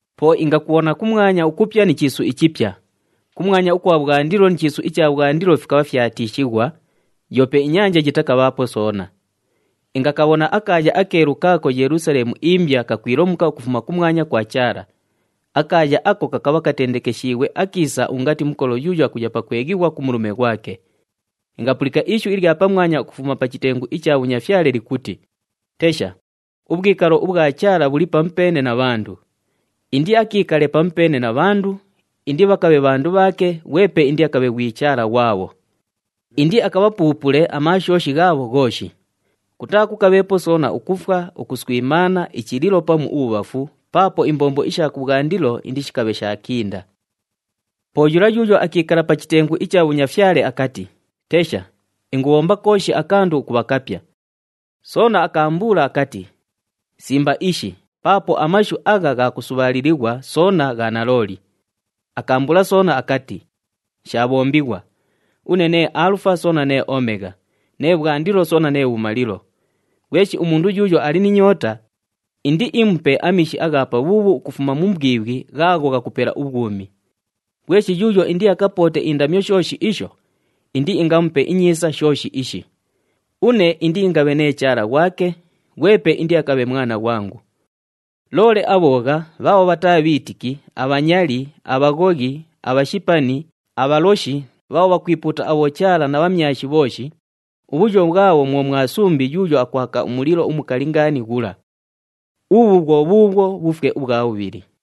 Po ingakubhona kumwanya ukupya ni chiisu ichipya. Kumwanya ukwa bhwandilo ni chiisu icha bhwandilo fikabha fyatiishighwa, yoope inyanja yitakabhaapo soona. Ingakabhona akaaya akeelu kaako Yelusaleemu imbya kakwilomuka ukufuma kumwanya kwa Chaala. Akaaya ako kakabha katendekeshiighwe akiisa ungati mukolo yuuyo akuya pakweghighwa ku mulume ghwake. Ingapulika ishu ilya pamwanya ukufuma pa chitengu icha bhunyafyale likuti, “Tesha! Ubhwikalo ubhwa Chaala bhuli pamupeene na bhandu. Indiakiikale pamupeene na bhandu, indibhakabhe bhandu bhaake, ghwepe indiakabhe ghwi Chaala ghwabho. Indiakabhapuupule amaashooshi ghaabho ghooshi. Kutaakukabheepo soona ukufwa, ukuswimaana, ichililo pamu ubhubhafu, paapo imbombo isha kubhwandilo indishikabhe shaakinda.” Po yula yuuyo akiikala pa chitengu icha bhunyafyale akati, “Tesha! Ingubhomba kooshi akandu ukubha kapya!” Soona akaambuula akati, “Simba ishi, paapo amashu agha gha kusubhaalilighwa soona gha nalooli.” Akaambuula soona akati, “Shaabhombighwa! Une nee Aalufa soona nee Omegha, nee Bhwandilo soona nee Bhumalilo. Ghweshi umundu yuuyo ali ni nyoota, indiimupe amiishi agha pabhuubhu ukufuma mu mbwibhwi ghaagho ghakupela ubhwumi. Ghweshi yuuyo indiakapoote indamyo shooshi isho, indiingamupe inyiisa shooshi ishi. Une indiingabhe nee Chaala ghwake, ghwepe indiakabhe mwana ghwangu. Loole abhoogha, bhaabho bhataa bhiitiki, abhanyali, abhaghoghi, abhashipani, abhaloshi, bhaabho bhakwipuuta abhochaala na bhamyashi bhooshi, ubhuyo bhwabho mwo mwa sumbi yuuyo akwaka umulilo umukali ngaani ghula. Ubhu bhwo bhuubhwo bhufwe ubhwa bhubhili.”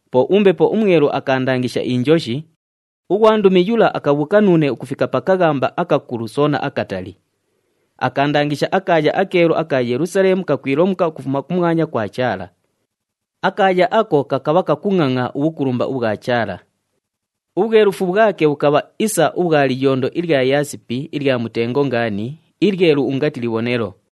Po uMbepo uMwelu akaandangisha injoshi, ughwandumi yula akabhuuka nuune ukufika pa kaghamba akakulu soona akatali. Akaandangisha akaaya akeelu aka Yelusaleemu kakwilomuka ukufuma kumwanya kwa Chaala. Akaaya ako kakabha kakungʼangʼa ubhukulumba ubhwa Chaala. Ubhwelufu bhwake bhukabha isa ubhwa liyondo ilya yaasipi ilya mutengo ngaani, ilyelu ungati libhonelo.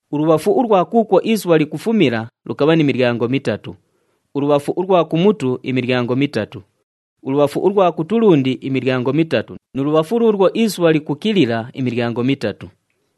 Ulubhafu ulwa kuukwo isubha likufumila, lukabha ni milyango mitatu, ulubhafu ulwa kumutu, imilyango mitatu, ulubhafu ulwa kutulundi, imilyango mitatu nu lubhafu luulwo isubha likukilila, imilyango mitatu.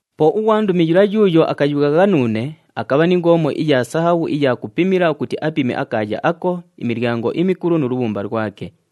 Po ughwandumi yula yuuyo akayughagha nuune, akabha ni ngoomo iya sahabhu iya kupimila ukuti apime akaaya ako, imilyango imikulu nu lubhumba lwake.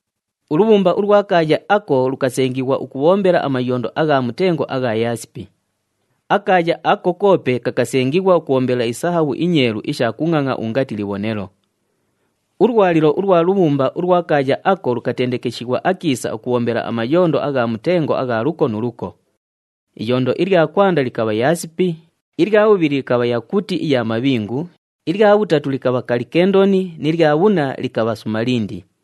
Ulubhumba ulwa kaaya ako lukasengighwa ukubhombela amayondo agha mutengo agha yaasipi. Akaaya ako koope kakasengighwa ukubhombela isahabhu inyeelu isha kungʼangʼa ungati libhonelo. Ulwalilo ulwa lubhumba ulwa kaaya ako lukatendekeshighwa akiisa ukubhombela amayondo agha mutengo agha luko nu luko. Iyondo ilya kwanda likabha yaasipi, ilya bhubhili likabha yakuti iya mabhingu, ilya bhutatu likabha kalikendoni ni lya bhunna likabha sumalindi.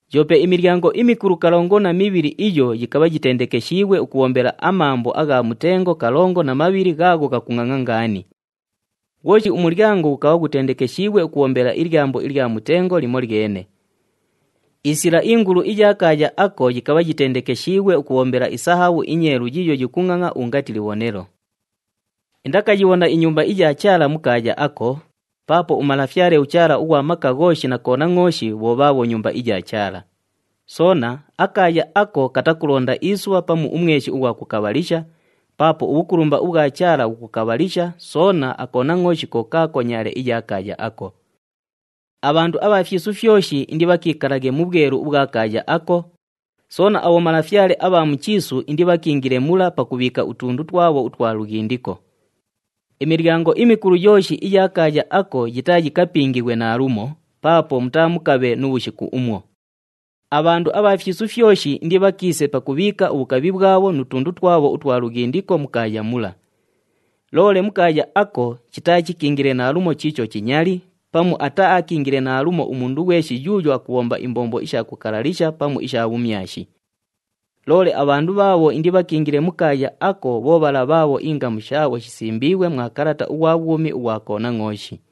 Yoope imilyango imikulu kalongo na mibhili iyo yikabha yitendekeshiighwe ukubhombela amambo agha mutengo kalongo na mabhili ghaagho ghakungʼangʼa ngaani. Ghwoshi umulyango ghukabha ghutendekeshiighwe ukubhombela ilyambo ilya mutengo limolyene. Isila ingulu iya kaaya ako yikabha yitendekeshiighwe ukubhombela isahabhu inyeelu yiiyo yikungʼangʼa ungati libhonelo. Indakayibhona iNyumba iya Chaala mu kaaya ako, paapo uMalafyale uChaala ughwa Maka Ghooshi na Konangʼooshi bho bhaabho Nyumba iya Chaala. Soona, akaaya ako katakulonda isubha pamu umweshi ughwa kukabhalisha, paapo ubhukulumba ubhwa Chaala bhukukabhalisha, soona aKonangʼooshi ko kaako nyaale iya kaaya ako. Abhandu abha fyisu fyoshi indibhakiikalaghe mu bhwelu ubhwa kaaya ako, soona abhomalafyale abha mu chiisu indibhakiingile mula pakubhiika utundu twabho utwa lughindiko. Imilyango imikulu yooshi iya kaaya ako yitaayikapingighwe naalumo, paapo mutaamukabhe nu bhushiku umwo. Abhandu abha fyisu fyoshi indibhakiise pakubhiika ubhukabhi bhwabho nu tundu twabho utwa lughindiko mu kaaya mula. Loole mu kaaya ako, chitaachikiingile naalumo chiicho chinyali, pamu ataaakiingile naalumo umundu ghweshi yuuyo akubhomba imbombo isha kukalalisha pamu isha bhumyashi. Loole abhandu bhaabho indibhakiingile mu kaaya ako bho bhala bhaabho ingamu shaabho shisimbiighwe mwa kalata ughwa bhwumi ughwa Konangʼooshi.